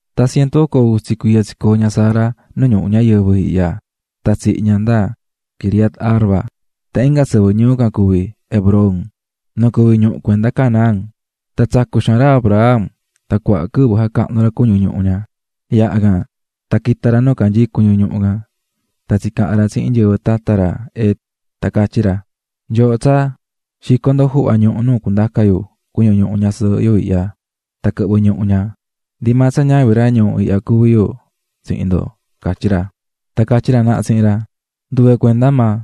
Tan cientu oco utsa cuiya tsicoo̱ ña Sara nu ñuhu ñayɨvɨ ihya. Tan tsihi̱ ña nda Quiriat-arba tan inga sɨvɨ ñuu can cuví Hebrón, nu cuví ñuhu cuenda Canaán. Tan tsacu̱ xaan ra Abraham tan cuaha quɨvɨ jacahnu̱ ra cuñu ñuhu ña. Yaha can tan quita̱ ra nu canyií cuñu ñuhu can tan tsicaha̱n ra tsihin nyɨvɨ tata ra Het, tan catyí ra: --Nyooho tsaa, xi̱co ndo juhva ñuhu nu cundaca yu cuñu ñuhu ñasɨɨhɨ yu ihya tan quɨhvɨ ñuhu ña, ndi maa tsa ñavin ra ñuu ndo ihya cuví yu --catyí ra. Tan catyí ra naha tsihin ra: --Nduve cuenda maa,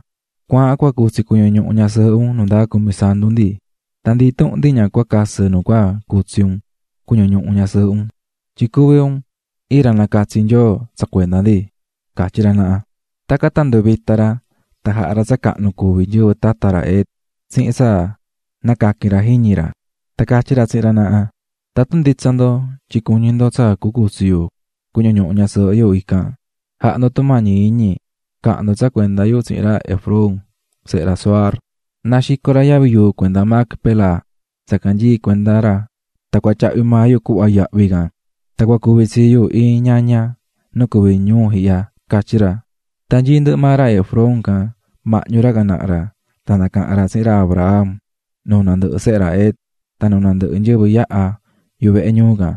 cua̱ahan, cua cutsi cuñu ñuhu ñasɨɨhɨ un nu ndaa cumisantu ndi, ndi intuhun ndi ña cua casɨ nu cutsi un cuñu ñuhu ñasɨɨhɨ un. Tyin cuví un iin ra nacatsi̱ Nyoo tsa cuenda ndi --catyí ra naha. Tacan tan nduvita̱ ra tan jaha̱ ra tsa cahnu cuví nyɨvɨ tata ra Het tsihin tsa nacaqui̱n ra jiñi ra. Tan catyí ra tsihin ra naha: --Tatun nditsa ndo tyin cuñí ndo tsa cucutsi yu cuñu ñuhu ñasɨɨhɨ yu ican, ja̱ha ndo tumañi iñi ca̱han ndo tsa cuenda yu tsihin ra Efrón sehe ra Zohar, na xico ra yavi yuu cuenda Macpela, tsa canyií cuenda ra, tan cua tyahvi maa yu cuhva yahvi can. Tan cua cuvi tsii yu iin ñaña nu cuví ñuu ihya ―catyí ra. Tan nyií ndɨhɨ maa ra Efrón can mahñu ra can naha ra tan nacaha̱n ra tsihin ra Abraham nuu nandɨhɨ sehe ra Het tan nuu nandɨhɨ nyɨvɨ yahá yuhu vehe ñuu can: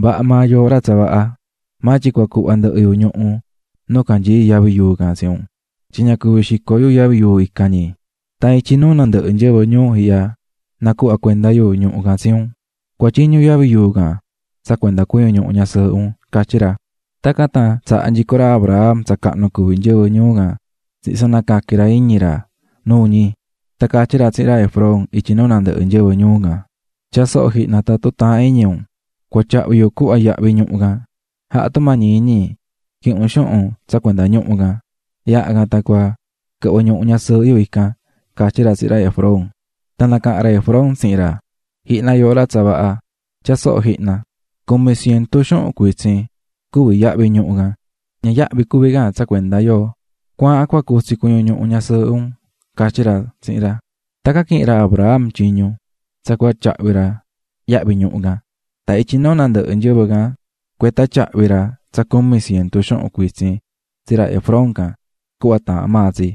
--Vaha maa yooho ra tsa vaha. Maa tyin cua cuhva ndɨhɨ yu ñuhu nu canyií yavi yuu can tsi un, tyin ña cuvi xico yu yavi yuu ican ñi. Tan ityi nuu nandɨhɨ nyɨvɨ ñuu yu ihya nacuhvá cuenda yu ñuhu can tsi un. Cua̱tyiñu yavi yuu can tsa cuenda cuñu ñuhu ñasɨɨhɨ un --catyí ra. Tacan tan tsaha̱ nyico ra Abraham tsa cahnu cuví nyɨvɨ ñuu can tsihin tsa nacaqui̱n ra iñi ra nuu ñi. Tan catyí ra tsihin ra Efrón ityi nuu nandɨhɨ nyɨvɨ ñuu can: --Tya̱a soho jihna tatun taahán iñi un, cua tyahvi yu cuhva yahvi ñuhu can. Ja̱ha tumañi iñi quihin un xuhun tsa cuenda ñuhu can. Yaha can tan cua quɨhvɨ ñuhu ñasɨɨhɨ yu ican --catyí ra tsihin ra Efrón. Tan nacaha̱n ra Efrón tsihin ra: --Ji̱hna, yooho ra tsa vaha, tyaa soho jihna, cumi cientu xuhun cuitsin cuví yahvi ñuhu can, ña yahvi cuví can tsa cuenda yoo. Cua̱ahan cua cutsi cuñu ñuhu ñasɨɨhɨ un --catyí ra tsihin ra. Tacan quihi̱n ra Abraham tyiñu tsa cua tyahvi ra yahvi ñuhu can. Tan ityi nuu nandɨhɨ nyɨvɨ can cueta tyahvi̱ ra tsa cumi cientu xuhun cuitsin tsi ra Efrón can cuhva taahán maa tsi.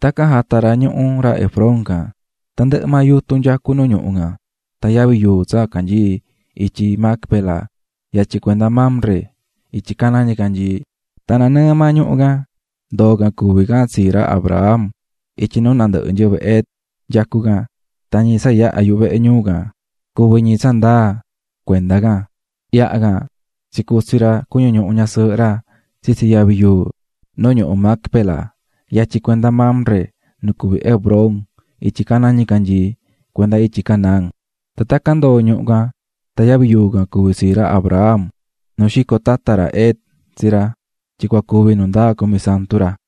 Tacan jata̱ ra ñuhu ra Efrón can, tandɨhɨ maa yutun nyacú nu ñuhu can, tan yavi yuu tsa canyií ityi Macpela yatyin cuenda Mamre ityi caná ñicanyii. Tan nanɨɨ maa ñuhu can, ndoo̱ can cuví can tsií ra Abraham ityi nuu nandɨhɨ nyɨvɨ Het nyacú can tan ñi tsa yahá yuhu vehe ñuu can, cuvi̱ ñi tsa ndaa cuenda can. Yaha can tsicutsi̱ ra cuñu ñuhu ñasɨɨhɨ ra tsitsi yavi yuu nu ñuhu Macpela, yatyin cuenda Mamre, nu cuví Hebrón, ityi caná ñicanyii, cuenda ityi Canaán. Tan tacan ndoo̱ ñuhu can tan yavi yuu can cuví tsii ra Abraham, nu xico̱ tata ra Het tsi ra, tyin cua cuvi nu ndaa cumisantu ra.